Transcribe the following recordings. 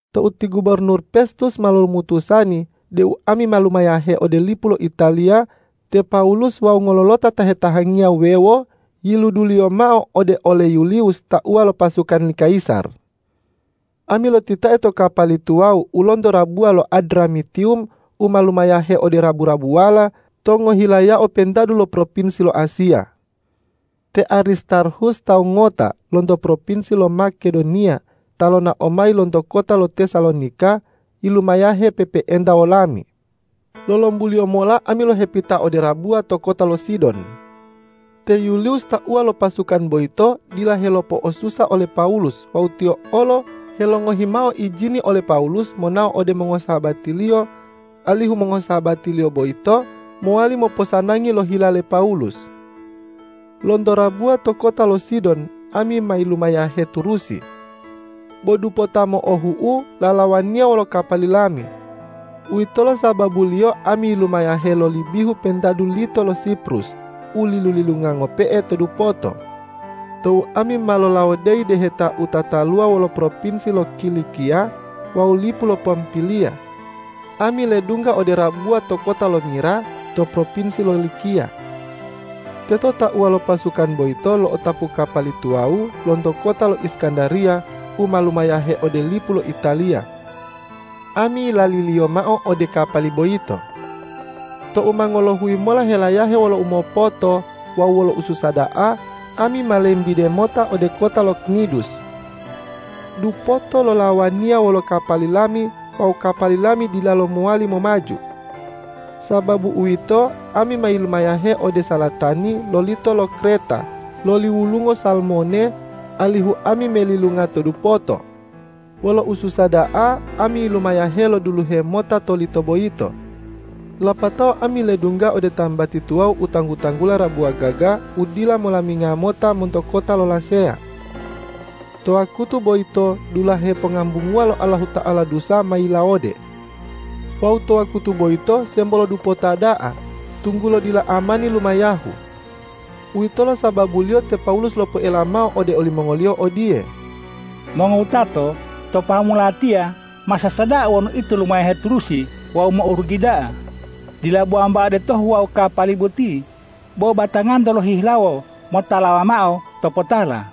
Tou ti gubornur Pestus ma lomutusani deu ami ma lumayahe ode lipu lo Italiya, te Pawulus wawu ngololota ta hetahangiya wuwewo yiluduliyo mao ode ole Yuliwus tauwa lo pasukan li kayisar. Ami lotitae to kapali tuwawu u lonto rabuwa lo Adramitiwum u ma lumayahe ode rabu-rabuwala to ngohilayao pentadu lo propinsi lo Asiya. Te Aristarhus tawu ngota lonto propinsi lo Makedoniya ta lonao mayi lonto kota lo Tesalonika, yilumayahe pe'epe'enta wolami. Lolombuliyo mola ami lohepita ode rabuwa to kota lo Sidon. Te Yuliwus tauwa lo pasukan boyito dila helopo'osusa ole Pawulus wawu tiyo olo helongohi mao ijini ole Pawulus monao ode mongosahabatiliyo, alihu mongosahabatiliyo boyito mowali moposanangi lo hila le Pawulus. Lonto rabuwa to kota lo Sidon ami ma lumayahe turusi, bo dupota mo'ohu'u lalawaniya wolo kapali lami. Uwitolo sababuliyo ami yilumayahe loli bihu pentadu lito lo Siprus u lilu-lilunga ngope'e to dupoto. Tou ami ma lolawodeyi deheta u tataluwa wolo propinsi lo Kilikiya wawu lipu lo Pampiliya, ami ledungga ode rabuwa to kota lo Mira to propinsi lo Likiya. Teto tauwa lo pasukan boyito lo'otapu kapali tuwawu lonto kota lo Iskandariya u ma lumayahe ode lipu lo Italiya. Ami yilaliliyo mao ode kapali boyito. Tou ma ngolohuyi mola helayahe wolo umopoto wawu wolo ususa da'a, ami ma lembide mota ode kota lo Knidus. Dupoto lalawaniya wolo kapali lami wawu kapali lami dilalo mowali momaju. Sababu uwito, ami ma yilumayahe ode salatani lo lito lo Kreta loli wulungo Salmone, alihu ami melilunga to dupoto. Wolo ususa da'a ami yilumayahe loduluhe mota to lito boyito. Lapatao ami ledungga ode tambati tuwawu u tanggu-tanggula Rabuwa Gaga, u dila molaminga mota monto kota lo Laseya. To wakutu boyito dulahe pongambunguwa lo Allahuta'ala dusa ma yilawode. Wawu to wakutu boyito sembo lo dupota da'a, tunggulo dila amani lumayahu. Uwitolo sababuliyo te Pawulus lopoela mao ode olimongoliyo odiye, ”Mongowutato, to pahamu latiya masasa da'a wonu ito lumayahe turusi wawu mo'orugi da'a, dila bo wambao detohu wawu kapali boti, bo batanganto lohihilawo motalawa mao topotala.”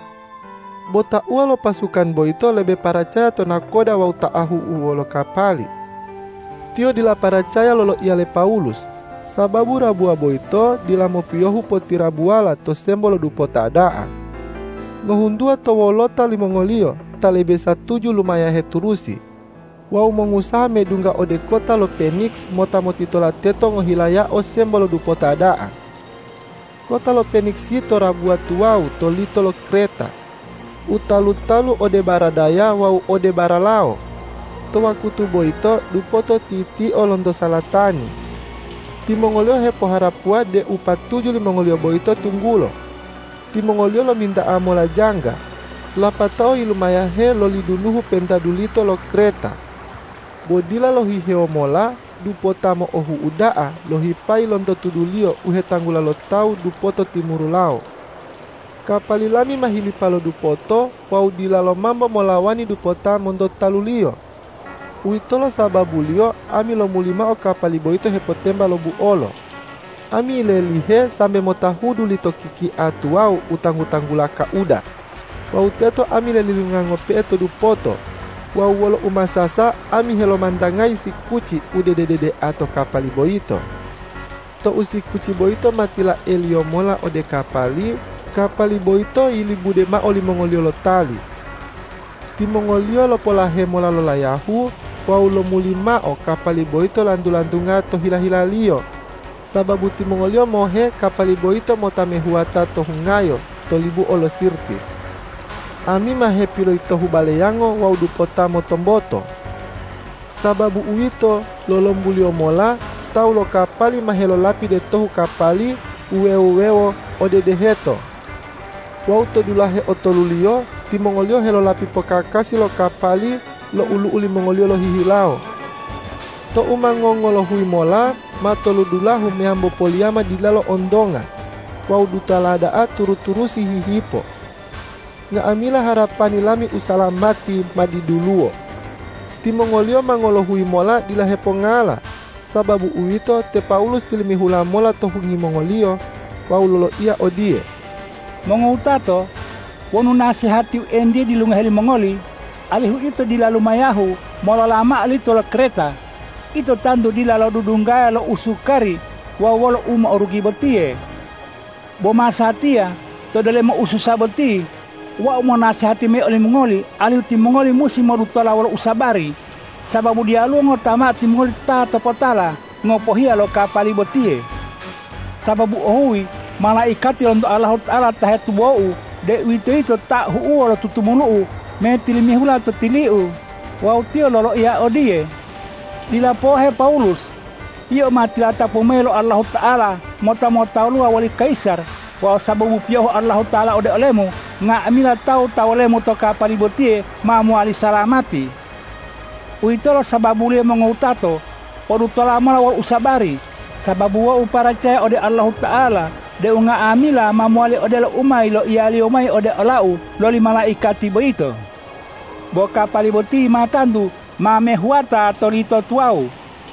Bo tauwa lo pasukan boyito lebe paracaya to nakoda wawu ta ahu'uwo lo kapali. Tiyo dila paracaya loloiya le Pawulus. Sababu rabuwa boyito dila mopiyohu potirabuwala to sembo lo dupota da'a. Ngohuntuwa to wolota limongoliyo ta lebe satuju lumayahe turusi wawu mongusaha medungga ode kota lo Peniks mota motitola teto ngohilayao sembo lo dupota da'a. Kota lo Peniks yito rabuwa tuwawu to lito lo Kreta, u talu-talu ode baradaya wawu ode baralawo. To wakutu boyito dupoto titio lonto salatani. Timongoliyo hepoharapuwa deu patuju limongoliyo boyito tunggulo. Timongoliyo lominta'a mola jangga, lapatao yilumayahe loli duluhu pentadu lito lo Kreta. Bo dila lohihewo mola dupota mo'ohu'u da'a lohipayi lonto tuduliyo u hetanggula lo tawu dupoto timuru lawo. Kapali lami ma hilipa lo dupoto wawu dilalo mambo molawani dupota monto taluliyo. Uwitolo sababuliyo ami lomuli mao kapali boyito hepotemba lo buolo. Ami yilelihe sambe motahudu lito kikia tuwawu u tanggu-tanggula Kauda wawu teto ami lelilunga ngope'e to dupoto wawu wolo umasasa ami helomantangayi sikuci u dede-dedea to kapali boyito. Tou sikuci boyito ma tilaeliyo mola ode kapali, kapali boyito yilibude mao limongoliyo lo tali. Timongoliyo lopolahe mola lo layahu wawu lomuli mao kapali boyito lantu-lantunga to hila-hilaliyo, sababu timongoliyo mohe kapali boyito mota mehuwata to hungayo to libuo lo Sirtis. Ami ma hepiloyitohu baleyango wawu dupota motomboto. Sababu uwito, lolombuliyo mola tawu lo kapali ma helolapi detohu kapali wuwe-wuwewo ode deheto. Wawu to dulahe otoluliyo timongoliyo helolapi pokakasi lo kapali lo olu'u limongoliyo lohihilawo. Tou ma ngongolohuyi mola matolodulahu meyambo poliyama dilalo ontonga wawu dutala da'a turu-turusi hihipo. Nga'amila harapani lami usalamati ma diduluwo. Timongoliyo ma ngolohuyi mola dila hepongala. Sababu uwito, te Pawulus tilimihula mola to hungi mongoliyo wawu loloiya odiye,”Mongowutato, wonu nasehatiu entiye dilungohe limongoli, alihu ito dila lumahayu molola mao lito lo Kreta, ito tantu dila lodudunggaya lo usukari wawu wolo u mo'orugi botiye! Bo masatiya to delomo ususa botiye, wau monasehati mayi olimongoli alihu timongoli musi modutola wolo usabari, sababu diyaluwo ngota mao timongoli ta topotala, ngopohiya lo kapali botiye. Sababu ohuyi malaikati lonto Allahuta'ala ta hetubou, deuwitoyito Ta ahu'uwo lo tutumulu'u, metilimihula to tiliu wawu tiyo loloiya odiye, ’Dila pohe, Pawulus! Yio ma tilatapu mayi lo Allahuta'ala mota motaluwa woli kayisar wawu sababu piyohu Allahuta'ala ode olemu, nga'amila tawu ta wolemu to kapali botiye ma mowali salamati.’ Uwitolo sababuliyo mongowutato, podutola mola wolo usabari! Sababu wau paracaya ode Allahuta'ala deu nga'amila ma mowali odelo u ma yiloiya-Liyo mayi ode olau loli malaikati boyito. Bo kapali boti ma tantu ma mehuwata to lito tuwawu.”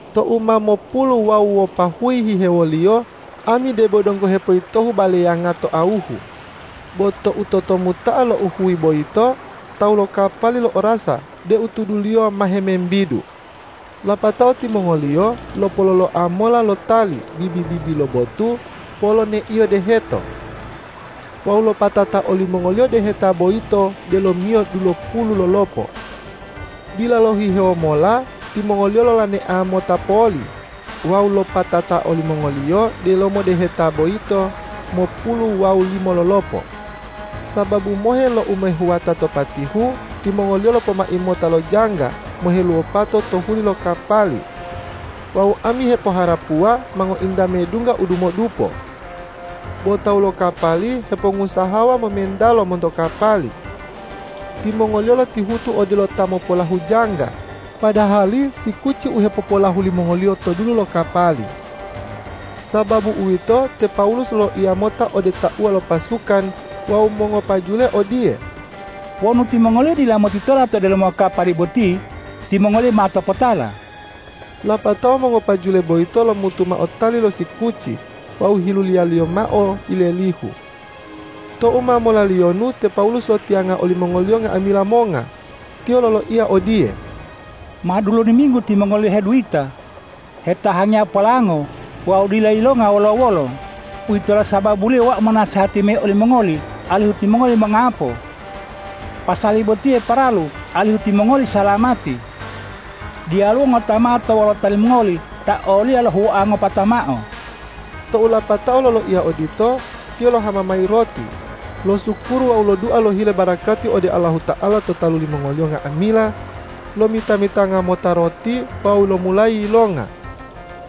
Tou ma mopulu wawu wopahuyi hihewoliyo, ami debo donggo hepoyitohu baleyanga to awuhu. Bo tou totomuta'a louhuyi boyito tawu lo kapali lo'orasa deu tuduliyo ma hemembidu. Lapatao timongoliyo lopololoa mola lo tali bibi-bibi lo botu poloneiyo deheto. Wawu lopatata olimongoliyo deheta boyito delomiyo dulopulu lolopo. Dila lohihewo mola timongoliyo lolonea mota poli wawu lopatata olimongoliyo delomo deheta boyito mopulu wawu limo lolopo. Sababu mohe lo u ma mehuwata to patihu, timongoliyo lopomai mota lo jangga moheluwopato to huli lo kapali wawu ami hepoharapuwa ma ngointa medungga u dumodupo. Bo tawu lo kapali hepongusahawa momentalo monto kapali. Timongoliyo lotihutu odelo ta mopolahu jangga, padahali sikuci u hepopolahu limongoliyo to dulu lo kapali. Sababu uwito, te Pawulus loloiya mota ode tauwa lo pasukan wawu mongopajule odiye,”Wonu timongoliyo dila motitola to delomo kapali boti, timongoli ma topotala.” Lapatao mongopajule boyito lomutu mao tali lo sikuci wawu hiluliyaliyo mao yilelihu. Tou ma molaliyonu te Pawulus lotiyanga olimongoliyo nga'amila monga. Tiyo loloiya odiye,”Ma dulodiminggu timongoli heduyita, hetahangiya polango wawu dila yilonga wolo-wolo. Uwitolo sababuliyo wau monasehati mayi olimongoli alihu timongoli mongapo. Pasali botiye paralu alihu timongoli salamati. Diyaluwo ngota mao to wolota limongoli ta oliya lohuwoa ngopata mao.” Tou lapatao loloiya odito, tiyo lohama mayi roti, losukuru wawu lodua lohile barakati ode Allahuta'ala to talu limongoliyo nga'amila, lomita-mitanga mota roti wawu lomulayi yilonga.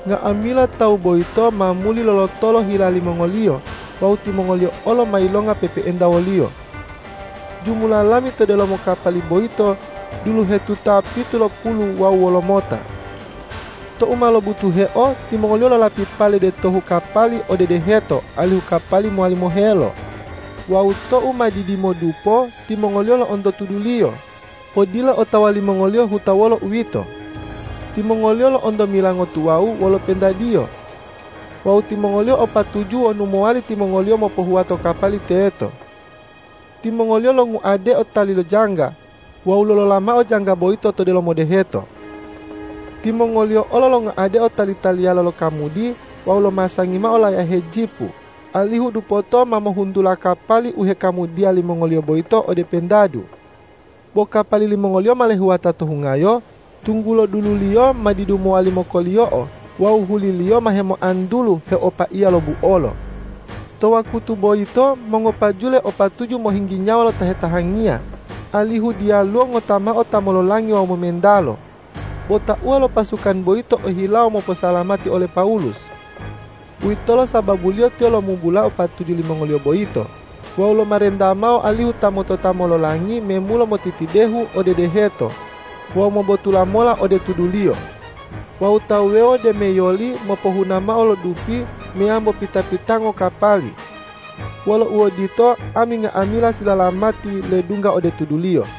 Nga'amila tawu boyito ma muli lolotolo hila limongoliyo wawu timongoliyo olo ma yilonga pe'epe'enta woliyo. Jumula lami to delomo kapali boyito dulohetuta pitulopulu wawu wolomota. Tou ma lobutuheo, timongoliyo lolapi pale detohu kapali ode deheto alihu kapali mowali mohelo. Wawu tou ma didimodupo timongoliyo lo'onto tuduliyo. Bo dila otawa limongoliyo huta lolo uwito. Timongoliyo lo'onto milango tuwawu wolo pentadiyo. Wawu timongoliyo o patuju wonu mowali timongoliyo mopohuwato kapali teto. Timongoliyo longuadeo tali lo jangga wawu lolola mao jangga boyito to delomo deheto. Timongoliyo olo longuadeo tali-taliyala lo kamudi wawu lomasangi mao layahe jipu, alihu dupoto ma mohuntula kapali u hekamudiya limongoliyo boyito ode pentadu. Bo kapali limongoliyo ma lehuwata to hungayo, tunggulo dululiyo ma didu mowali mokoliyo'o wawu huliliyo ma hemoantulu heopaiya lo buolo. To wakutu boyito mongopajule o patuju mohinggi nyawa lo ta hetahangiya, alihu diyaluwo ngota mao ta mololangi wawu momentalo. Bo tauwa lo pasukan boyito ohilawo moposalamati ole Pawulus. Uwitolo sababuliyo tiyo lomubulao patuju limongoliyo boyito wawu lomarenta mao alihu ta motota mololangi memulo motitidehu ode deheto wawu mobotula mola ode tuduliyo wawu ta wuwewo demeyoli mopohuna mao lo dupi meyambo pita-pitango kapali. Wolo uodito, ami nga'amila silalamati ledungga ode tuduliyo.